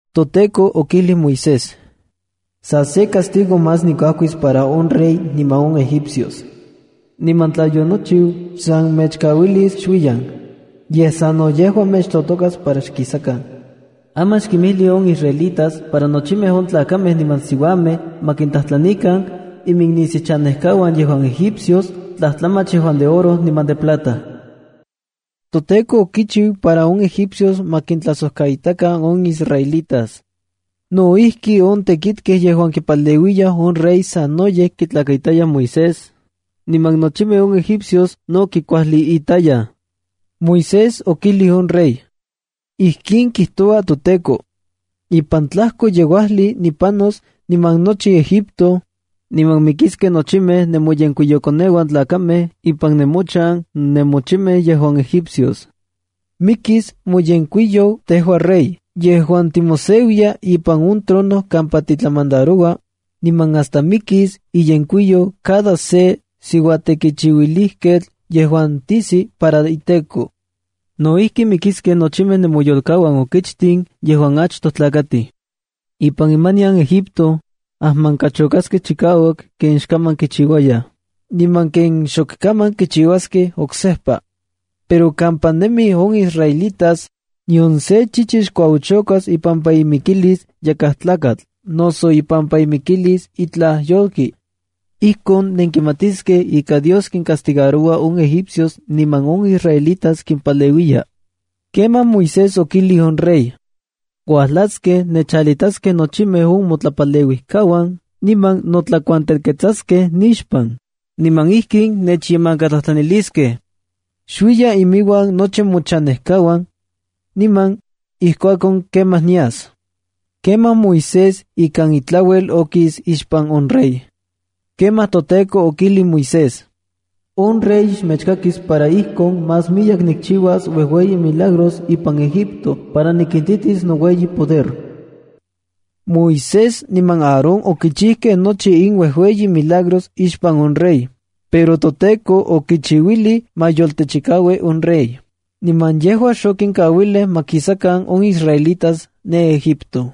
ToTEKO okijlij Moisés: —Sa se castigo más nikuajkis para on rey niman on egipcios. Niman tla yonochiu, xsan mechkauilis xuiyan, yej sa no yejua mechtotokas para xkisakan. Aman xkinmijli on israelitas para nochimej on tlakamej niman siuamej ma kintlajtlanikan iminnisiuchanejkauan yejuan Egipcios tlajtlamach yejuan de oro niman de plata. ToTEKO okichiu para on egipcios ma kintlajsojkaitakan on israelitas. No ijki, on tekitkej yejuan kipaleuiyaj on rey sanoyej kitlakaitayaj Moisés, niman nochimej on egipcios no kikuajliitayaj. Moisés okijlij on rey: —Ijkin kijtoua toTEKO: “Ipan tlajkoyeuajli nipanos ipan nochi Egipto, niman mikiskej nochimej nemoyenkuiyokoneuan tlakamej ipan nemochan nemochimej yejuan egipcios. Mikis moyenkuiyou tejua rey yejuan timoseuiya ipan on trono kampa titlamandaroua, niman hasta mikis iyenkuiyou cada se siuatekichiuilijketl yejuan tijsi para iteko. No ijki, mikiskej nochi nemoyolkauan okichtin yejuan achtoj tlakatij. Ipan imanian Egipto, ajmankachokaskej chikauak ken xkaman kichiuayaj, niman ken xok kaman kichiuaskej oksejpa. Pero kampa nemij on israelitas, nion sen chichi xkuaochokas ipampa imikilis yakaj tlakatl noso ipampa imikilis itlaj yolki. Ijkon nenkimatiskej ika Dios kincastigaroua on egipcios niman on israelitas kimpaleuiya.” Kemaj Moisés okijlij on rey: —Uajlaskej nechalitaskej nochimej on motlapaleuijkauan niman notlakuantelketsaskej nixpan, niman ijkin nechyemankatlajtlaniliskej: “Xuiya inmiuan nochi mochanejkauan.” Niman, ijkuakon kemaj, nias. Kemaj Moisés ikan itlauel okis ixpan on rey. Kemaj toTEKO okijlij Moisés: —On rey xmechkakis para ijkon más miyek nikchiuas uejueyi milagros ipan Egipto para nikintitis noueyi poder. Moisés niman Aarón okichijkej nochi in uejueyi milagros ixpan on rey, pero toTEKO okichiuilij ma yoltechikaui on rey, niman yejua xokinkauilij ma kisakan on israelitas ne Egipto.